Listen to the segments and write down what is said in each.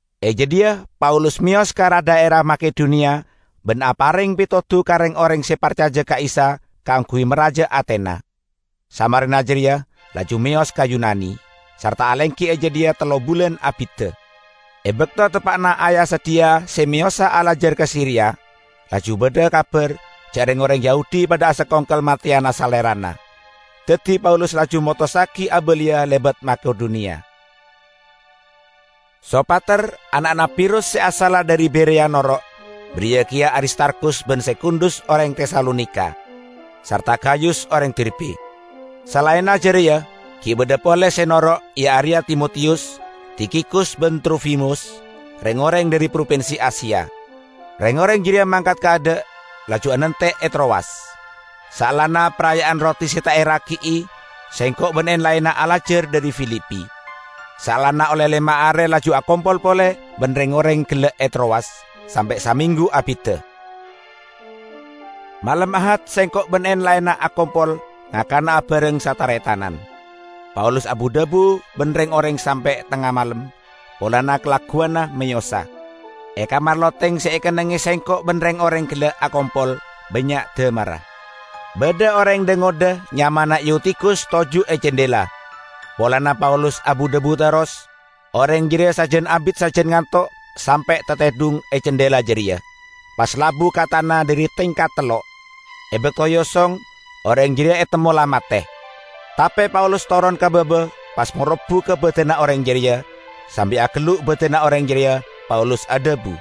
E jadhiya Paulus meyos ka ra-dhaera Makedoniya ban apareng petodu ka reng-oreng se parcaja ka Isa kaangguy maraja atena. Samarena jareya laju meyos ka Yunani, sarta alenggi e jadhiya tello bulan abidda. E bakto teppa'na aya-sadhiya se meyosa alajar ka Siria, laju badha kabar ja' reng-oreng Yahudi padha asakongkel mateyana salerana. Daddi Paulus laju motossagi abaliya lebat Makedoniya. Sopater, ana'na Pirus se asalla dhari Bereya noro', bariya keya Aristarkhus ban Sekundus oreng Tesalonika, sarta Gayus oreng Derbe. Salaenna jareya gi' badha pole se noro', iya areya Timotiyus, Tikhikus ban Trofimus, reng-oreng dhari propinsi Asia. Reng-oreng jareya mangkat kaadha', laju anante' e Trowas. Saellana Paraya'an Roti Se Ta' Eragi'i sengko' ban en-laenna alajar dhari Filipi. Saellana olle lema are laju akompol pole ban reng-oreng gella' e Trowas, sampe' samenggu abidda. Malem Ahad sengko' ban en-laenna akompol ngakana abareng sataretanan. Paulus abu-dhabu ban reng-oreng sampe' tengnga malem, polana kalagguwanna meyosa. E kamar loteng se ekennengnge sengko' ban reng-oreng gella' akompol, bannya' damarra. Badha oreng dha-ngodha nyamana Eutikhus toju' e candhela. Polana Paulus abu-dhabu terros, oreng jareya sajan abit sajan ngantok, sampe' tatedhung e candhela jareya, pas labu ka tana dhari tingkat tello'. E bakto eosong, oreng jareya etemmo la mate. Tape Paulus toron ka baba, pas marobbu ka badanna oreng jareya. Sambi agellu' badanna oreng jareya, Paulus adhabu,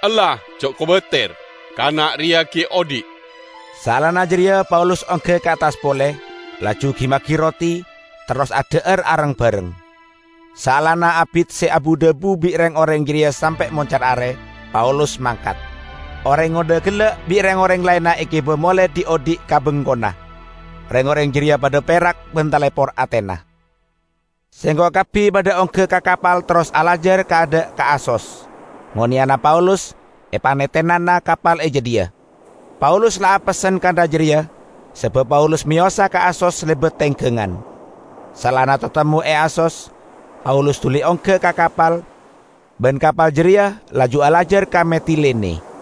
"Ella ja' kobater, kana' reya gi' odhi'!" Saellana jareya Paulus ongga ka attas pole, laju gi-magi roti, terros adha'ar areng-bareng. Saellana abit se abu-dhabu bi' reng-oreng jareya sampe' moncar are, Paulus mangkat. Oreng ngodha gella' bi' reng-oreng laenna egiba mole dhi'-odhi' ka bengkona. Reng-oreng jareya padha perak ban talepor atena. Sengko' kabbi padha ongga ka kapal terros alajar kaadha' ka Asos, ngoneyana Paulus epanetenana kapal e jadhiya. Paulus la apessen kantha jareya, sabab Paulus meyosa ka Asos lebat tenggangan. Saellana tatemmo e Asos, Paulus duli ongga ka kapal, ban kapal jareya laju alajar ka Metilene.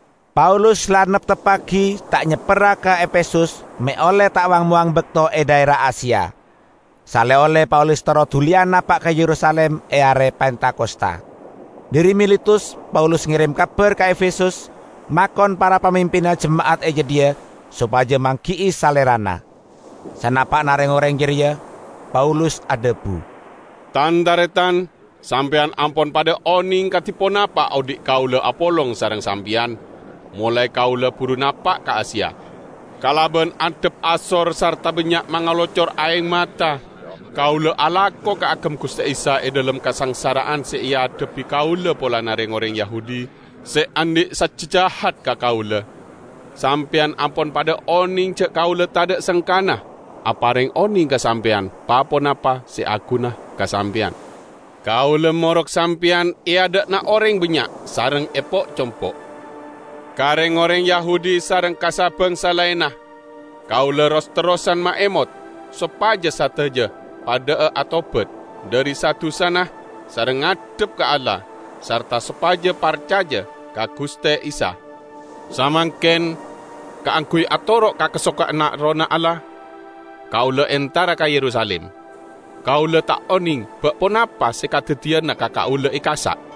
Paulus la neptebbagi ta' nyepperra ka Efesus me' olle ta' wang-mowang bakto e dhaera Asia. Sale-olle Paulus terro duliya napa' ka Yerusalim e are Pentakosta. Dhari Miletus Paulus ngerem kabar ka Efesus makon para pamimpinna jema'at e jadhiya sopaja manggi'i salerana. Sanapa'na reng-oreng jareya, Paulus adhabu, "Tan-taretan, sampeyan ampon padha oneng kadi ponapa odhi' kaula apolong sareng sampeyan, molae kaula buru napa' ka Asia. Kalaban andhap asor sarta bannya' mangalocor aeng mata kaula alako kaagem Guste Isa e dhalem kasangsara'an se eadhebbi kaula polana reng-oreng Yahudi se andhi' sajja jahat ka kaula. Sampeyan ampon padha oneng ja' kaula tadha' sengkana apareng oneng ka sampeyan pa-ponapa se aguna ka sampeyan. Kaula morok sampeyan e adha'na oreng bannya' sareng e po'-compo'. Ka reng-oreng Yahudi sareng ka sa-bangsa laenna kaula ros-terrosan maemot sopaja sadaja padha'a atobat dhari sa-dusana sareng ngadhep ka Allah, sarta sopaja parcaja ka Guste Isa. Samangken, kaangguy atoro' ka kasokanna Errohna Allah, kaula entara ka Yerusalim. Kaula ta' oneng, ba' ponapa se kadaddiyana ka kaula e ka'issa'.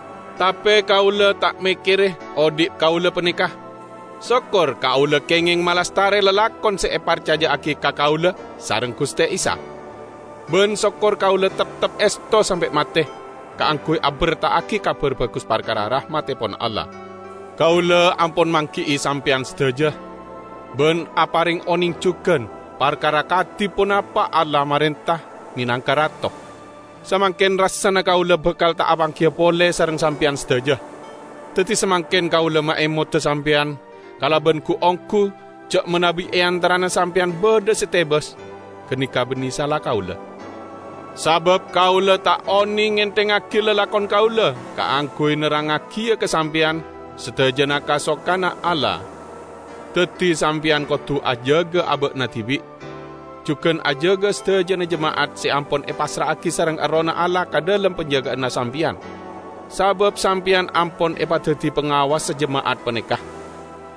Tape kaula ta' mekkere odhi' kaula paneka, sokor kaula kengeng malastare lalakon se eparcaja'agi ka kaula sareng Guste Isa, ban sokor kaula teptep esto sampe' mate kaangguy aberta'agi Kabar Bagus parkara rahmattepon Allah. Kaula ampon manggi'i sampeyan sadaja ban apareng oneng jugan parkara kadi ponapa Allah marenta menangka Rato. Samangken rassana kaula bakal ta' apanggiya pole sareng sampeyan sadaja. Daddi samangken kaula maemoda sampeyan kalaban gu-onggu ja' manabi e antarana sampeyan badha se tebas, ganeka banne sala kaula. Sabab kaula ta' oneng ngenthengngagi lalakon kaula kaangguy nerrangngagiya ka sampeyan sadajana kasokanna Allah. Daddi sampeyan kodu ajaga aba'na dibi', jugan ajaga sadajana jema'at se ampon epassra'agi sareng Errohna Allah ka dhalem panjaga'anna sampeyan; sabab sampeyan ampon epadaddi pangawassa jema'at paneka.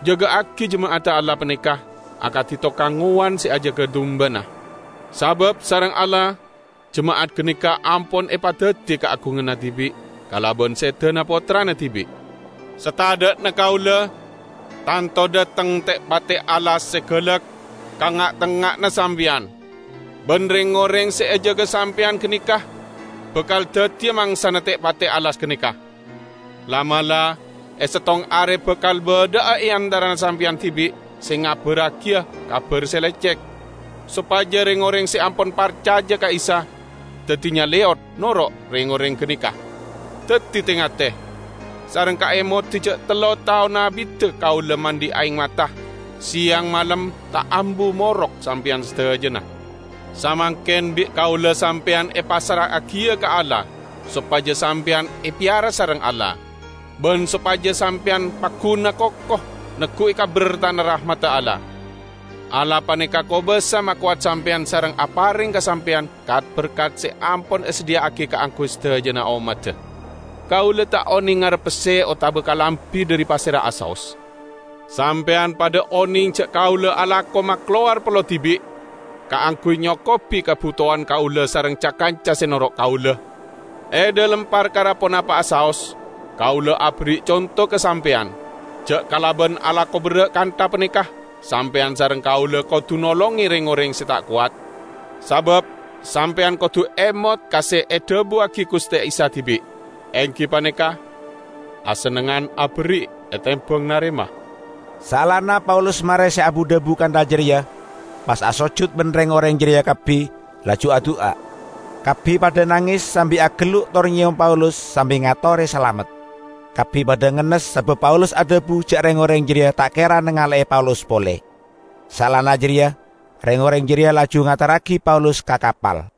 Jaga'agi jema'adda Allah paneka akadi tokang ngowan se ajaga dumbana, sabab sareng Allah jema'at ganeka ampon epadaddi kaagunganna dibi' kalaban sedana Pottrana dibi'. Satadha'na kaula, tanto dhateng te'-pate' alas se galak ka nga'-tengnga'anna sampeyan. Ban reng-oreng se ejaga sampeyan ganeka bakal daddiya mangsana te'-pate' alas ganeka. La'-mala' e settong are bakal badha'a e antarana sampeyan dibi' se ngabarragiya kabar se lecek, sopaja reng-oreng se ampon parcaja ka Isa daddi nyaleyot noro' reng-oreng ganeka. Daddi, te-ngate! Sareng kaemodi ja' tello taon abidda kaula mandhi aeng mata, seyang malem ta' ambu morok sampeyan sadajana. Samangken bi' kaula sampeyan epassra'agiya ka Allah sopaja sampeyan epeyara sareng Allah, ban sopaja sampeyan pagguna koko neggu'i ka bertana rahmadda Allah. Allah paneka kobasa makowat sampeyan sareng apareng ka sampeyan kat-berkat se ampon esadhiya'agi kaangguy sadajana ommadda. Kaula ta' oneng ngarep pesse otaba kalambi dhari pasera'a saos. Sampeyan padha oneng ja' kaula alako makalowar pello dibi' kaangguy nyokobi kabutowan kaula sareng ca-kanca se noro' kaula. E dhalem parkara ponapa'a saos kaula aberri' conto ka sampeyan ja' kalaban alako berra' kantha paneka sampeyan sareng kaula kodu nolonge reng-oreng se ta' kowat. Sabab sampeyan kodu emot ka se edhabuwagi Guste Isa dibi', enggi paneka, 'Asennengngan aberri' etembang narema.' " Saellana Paulus mare se abu-dhabu kantha jareya pas asojut ban reng-oreng jareya kabbi, laju adu'a. Kabbi padha nanges sambi agellu' tor nyeyom Paulus sambi ngatore salamet. Kabbi padha ngennes sabab Paulus adhabu ja' reng-oreng jareya ta' kera nangale'e Paulus pole. Saellana jareya reng-oreng jareya laju ngaterragi Paulus ka kapal.